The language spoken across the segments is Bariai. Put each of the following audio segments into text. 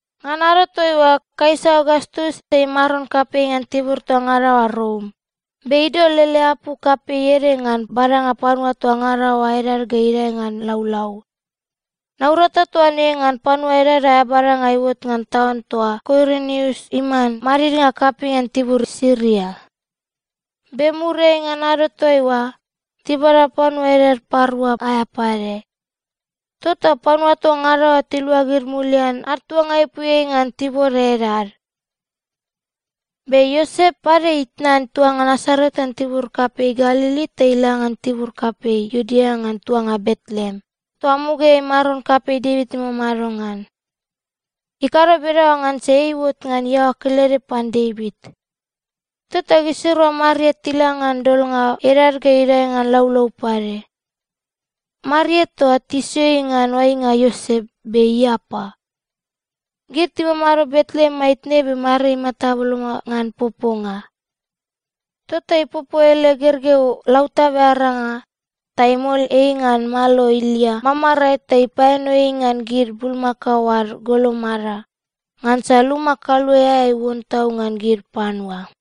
Ngan ado toaiua, Kaisa Ogastus ei maron kapei ngan tibur toa ngada oa Rom, be idol ele apu kapei ede ngan badanga panua toa ngada oa edad ga idae ngan laulau. Naurata toa ne ngan panua edad aea badanga iuot ngan taun toa Kuirinius iman madidnga kapei ngan tibur Siria. (Be muriai ngan ado toaiua, tibada panua edad parua aea pade.) Tota panua toa ngada oa tiluagid mulian ad tuanga ipuiai ngan tibode edad. Be Iosep pade itnan tuanga Nasaret ngan tibur kapei Galili ta ila ngan tibur kapei Iudea ngan tuanga Betleem, toa mugaeai maron kapei Devit imamado ngan. Ikado bedaoa ngansa ei iuot ngan iaoa kelede pan Devit. Tota gisirua Maria tila ngan dolnga edad ga idae ngan laulau pade. Maria toa, tisio ei ngan oainga Iosep, be iapa. Gid timamado Betleem maitne be Maria imata boloma ngan poponga. Tota ipopo ele gergeu lautabe aranga ta imol ei ngan malo ilia mamarae ta ipaeno ei ngan gid bulmakao ad golomada, ngansa luma kaluae aea iuon tau ngan gid panua.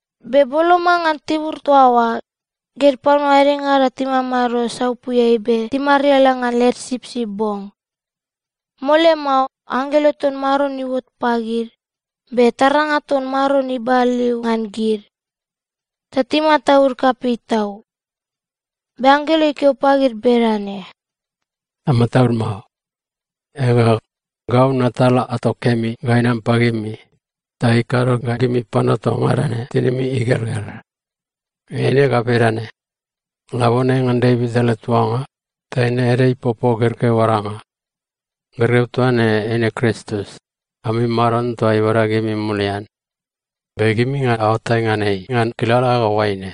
Be boloma ngan tibur toa oa, gid panua edengada timamado saupuiai be timariala ngan led sipsip bong. Mole mao, anggelo ton Maron iuot pagid, be taranga ton Maron ibaliu ngan gid. Ta timataud kapei tau. Be anggelo ikeo pagid bedane, “Amataud mao. Ega, gau natal ato kemi ga inam pagimi, ta ikado ga gimi panua toa ngada ne tinimi igelgel. Eine ga bedane: Labone ngan Devit ele tuanga, taine ede ipopo gergeu aranga. Gergeu toa ne eine Kristus ami Maron toa ibada gimi mulian. Be gimi ga aoatai ngan ei ngan kilala ga oaine: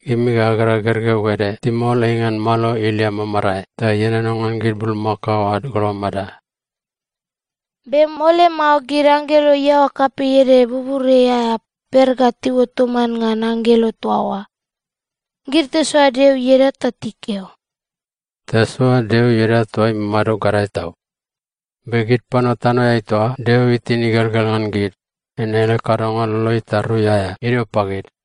Gimi ga agera gergeu ede timol ei ngan malo ilia mamarae ta ienono ngan gid bulmakao ad golomada.” Be mole mao gid anggelo iaoa kapei ede buburiai aea per ga tiuot toman ngan anggelo toa oa. Gid tisoa Deo ieda ta tikeo, “Tasoa Deo ieda toa imamado gadae tau! Be gid panua tanoeai toa Deo itin igelgel ngan gid, eine ele kadonga lolo tarui aea idio pagid.”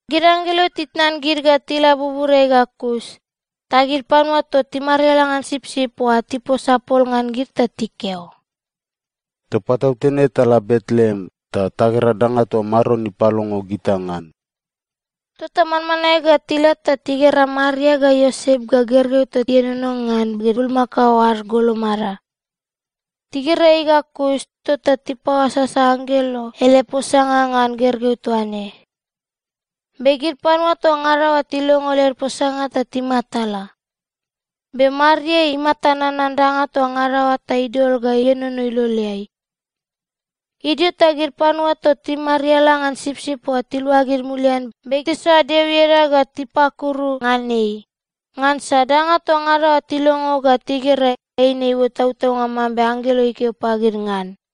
Gid anggelo titnan gid ga tila buburiai ga kus, ta gid panua toa timariala ngan sipsip oa tiposa pol ngan gid ta tikeo, “Toa patautene tala Betleem ta tagera danga toa Maron ipalongo gita ngan!” Tota manmanae ga tila ta tigera Maria ga Iosep ga gergeu toa ienono ngan gid bulmakao ad golomada. Tigera ei ga kus, tota tipaoasasa anggelo ele posanga ngan gergeu toa ne. Be gid panua toa ngada oa tilongo led posanga ta timatala. Be Maria imata nanan danga toa ngada oa ta idol ga ienono iloleai. Idio ta gid panua toa timariala ngan sipsip oa tiluagid mulian be tisoa Deo ieda ga tipakuru ngan ei, ngansa danga toa ngada oa tilongo ga tigera, eine iuot tautaunga mambe anggelo ikeo pagid ngan.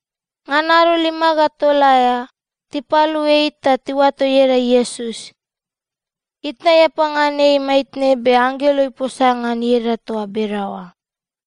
Ngan ado lima ga tol aea, tipalu ei ta tiuato ieda Iesus. Itna iapa ngan ei maitne be anggelo iposa ngan ieda toa bedaoa.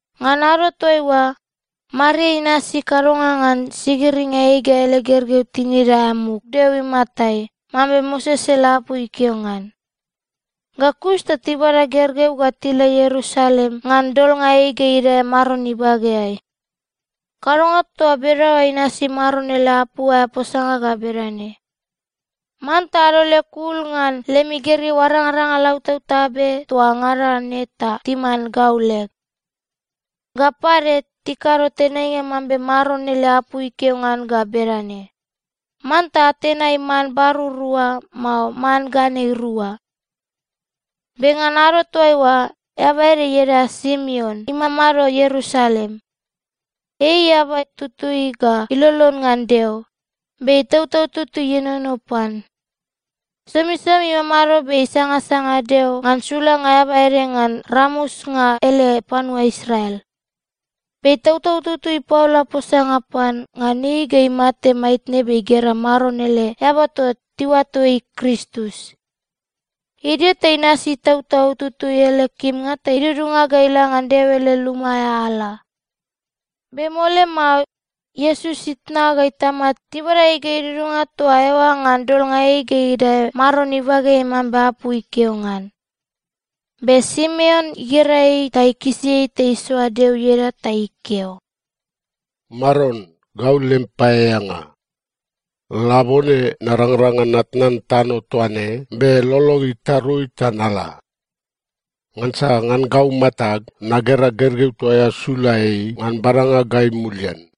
Ngan ado toaiua, Maria inasi kadonga ngan sigiringa ei ga ele gergeu tinid aea muk Deo imatai mambe Moses ele apu ikeo ngan. Ga kus ta tibada gergeu ga tila Ierusalem ngan dolnga ei ga idae Maron ibageai. Kadonga toa bedaoa inasi Maron ele apu aea posanga ga bedane, “Manta adol leg ul ngan lemi gergeu arangaranga lautabtabe toa ngada ne ta timan gau leg.” Ga pade, tikado tenainga mambe Maron ele apu ikeo ngan ga bedane, “Manta atenai man barur rua, mao man ganei rua.” Be ngan ado toaiua, eaba ede ieda Simeon imamado Ierusalem. Ei eaba tutui ga ilolon ngan Deo, be Itautau Tutui ienono pan. Somisomi imamado be isangasanga Deo ngan sulanga eaba ede ngan ramusnga ele panua Israel. Be Itautau Tutui ipaola posanga pan, ngan ei ga imate maitne be igera Maron ele eaba toa tiuato ei Kristus. Idio ta inasi Itautau Tutui ele kimnga ta idudunga ga ila ngan Deo ele luma aea ala. Be mole mao, Iesus itna ga itama tibada ei ga idudunga toa eoa ngan dolnga ei ga idae Maron ibageai mambe apu ikeo ngan. Be Simeon igera ei ta ikisi ei ta isoa Deo ieda ta ikeo, “Maron, gau lem paeaeanga. Labone narangrang ngan natnan tano toa ne be lolog itarui ta nala. Ngansa ngan gau matag nagera gergeu toa eao sula ei ngan badanga gai mulian.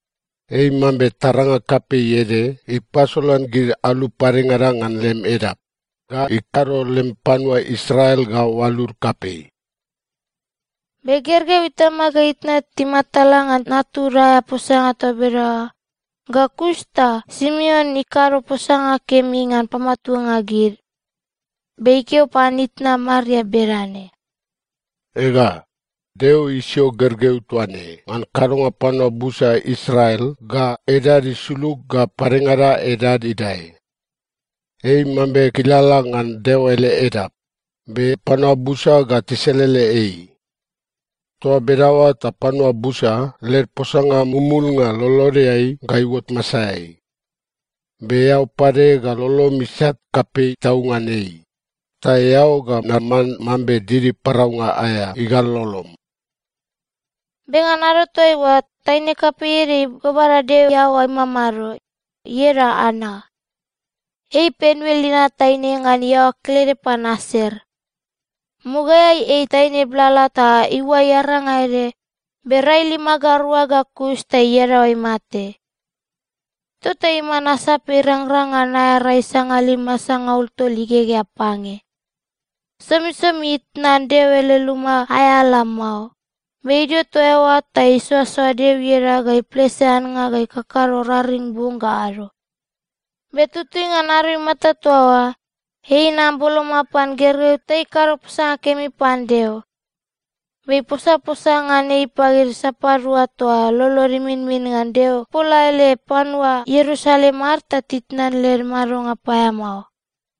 Ei mambe taranga kapei ede ipasolan gid alu padengada ngan lem edap, ga ikado lem panua Israel ga oalud kapei.” Be gergeu itama ga itna timatala ngan natud aea posanga toa bedaoa. Ga kus ta Simeon ikado posanga kemi ngan pamatuanga gid. Be ikeo pan itna Maria bedane, “Ega, Deo isio gergeu toa ne ngan kadonga panua busa Israel ga edad isulug ga padengada edad idae. Ei mambe kilala ngan Deo ele edap, be panua busa ga tiselele ei. Toa bedaoa ta panua busa led posanga mumulnga lolodeai ga iuot masaeai. Be eao pade ga lolom isat kapei tau ngan ei, ta eao ga naman mambe didi paraunga aea igal lolom.” Be ngan ado toaiua, taine kapei ede ibabada Deo iaoa imamado, ieda Ana. Ei Panuel inat taine ngan iaoa kelede pan Aser. Mugaeai ei taine blala ta iuai aranga ede, be rai lima ga rua ga kus ta iadaoa imate. Tota iman asape irangrang ngan aea rai sangalima sangaul tol igegea pange. Somisomi itnan Deo ele luma aea ala mao, be idio toa eoa ta isoasoa Deo ieda ga iplese annga ga ikakado raring bong ga ado. Be tutui ngan ado imata toa oa, ei inam boloma pan gergeu ta ikado posanga kemi pan Deo, be iposaposa ngan ei pagid sapadua toa lolod iminmin ngan Deo ipola ele panua Ierusalem ad ta titnan led madonga paeamao.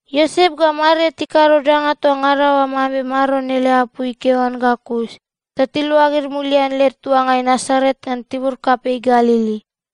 Iosep ga Maria tikado danga toa ngada oa mambe Maron ele apu ikeo ngan ga kus, ta tiluagid mulian led tuangai Nasaret ngan tibur kapei Galili.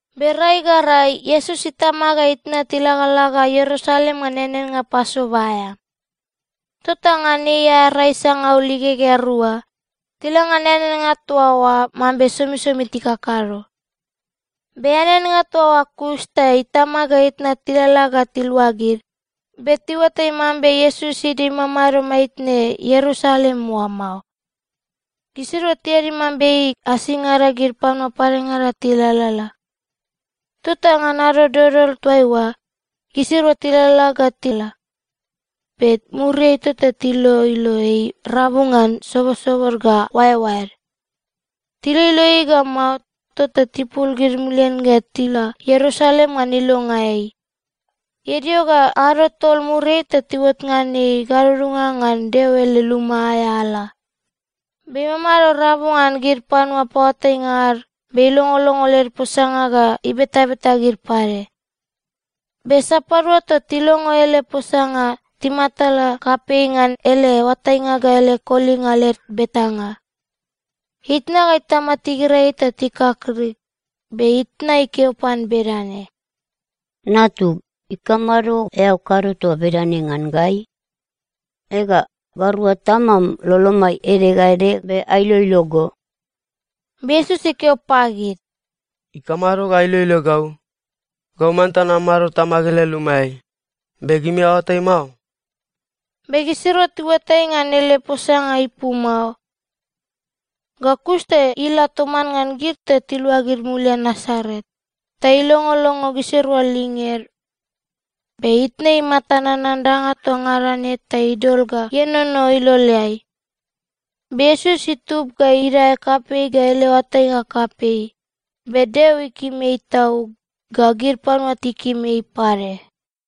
Be rai ga rai, Iesus itama ga itna tilagalaga Ierusalem ngan eaneannga Pasova aea. Tota ngan ei aea rai sangaul igegea rua, tila ngan eaneannga toa oa mambe somisomi tikakado. Be eaneannga toa oa kus, ta itama ga itna tilalala ga tiluagid. Be tiuatai mambe Iesus idio imamado maitne Ierusalem oa mao. Gisirua tiadi mambe ei asingada gid panua padengada tilalala. Tota ngan ado dodol toaiua, gisirua tilalala ga tila. Be muriai tota tiloilo ei rabu ngan sobosobod ga oaeoaed. Tiloilo ei ga mao, tota tipul gid mulian ga tila Ierusalem ngan ilonga ei. Idio ga ado tol muriai ta tiuot ngan ei gadudunga ngan Deo ele luma aea ala, be imamado rabu ngan gid panua paoatainga ad be ilongolongo led posanga ga ibetabeta gid pade. Be sapadua toa tilongo ele posanga, timatala kapei ngan ele oatainga ga ele kolinga led betanga. Itna ga itama tigera ei ta tikakrik, be itna ikeo pan bedane, “Natug, ikamado eao kado toa bedane ngan gai? Ega, gairua tamam lolomai ede ga ede be ailoilo go.” Be Iesus ikeo pagid, “Ikamado ga ailoilo gau? Gau manta namamado Tamag ele lumaeai, be gimi aoatai mao?” Be gisirua tiuatai ngan ele posanga ipu mao. Ga kus ta ila toman ngan gid ta tiluagid mulian Nasaret, ta ilongolongo gisirua linged. Be itna imata nanan danga toa ngada ne ta idol ga ienono iloleai. Be Iesus itub ga idae kapei ga ele oatainga kapei, be Deo ikim ei tau, ga gid panua tikim ei pade.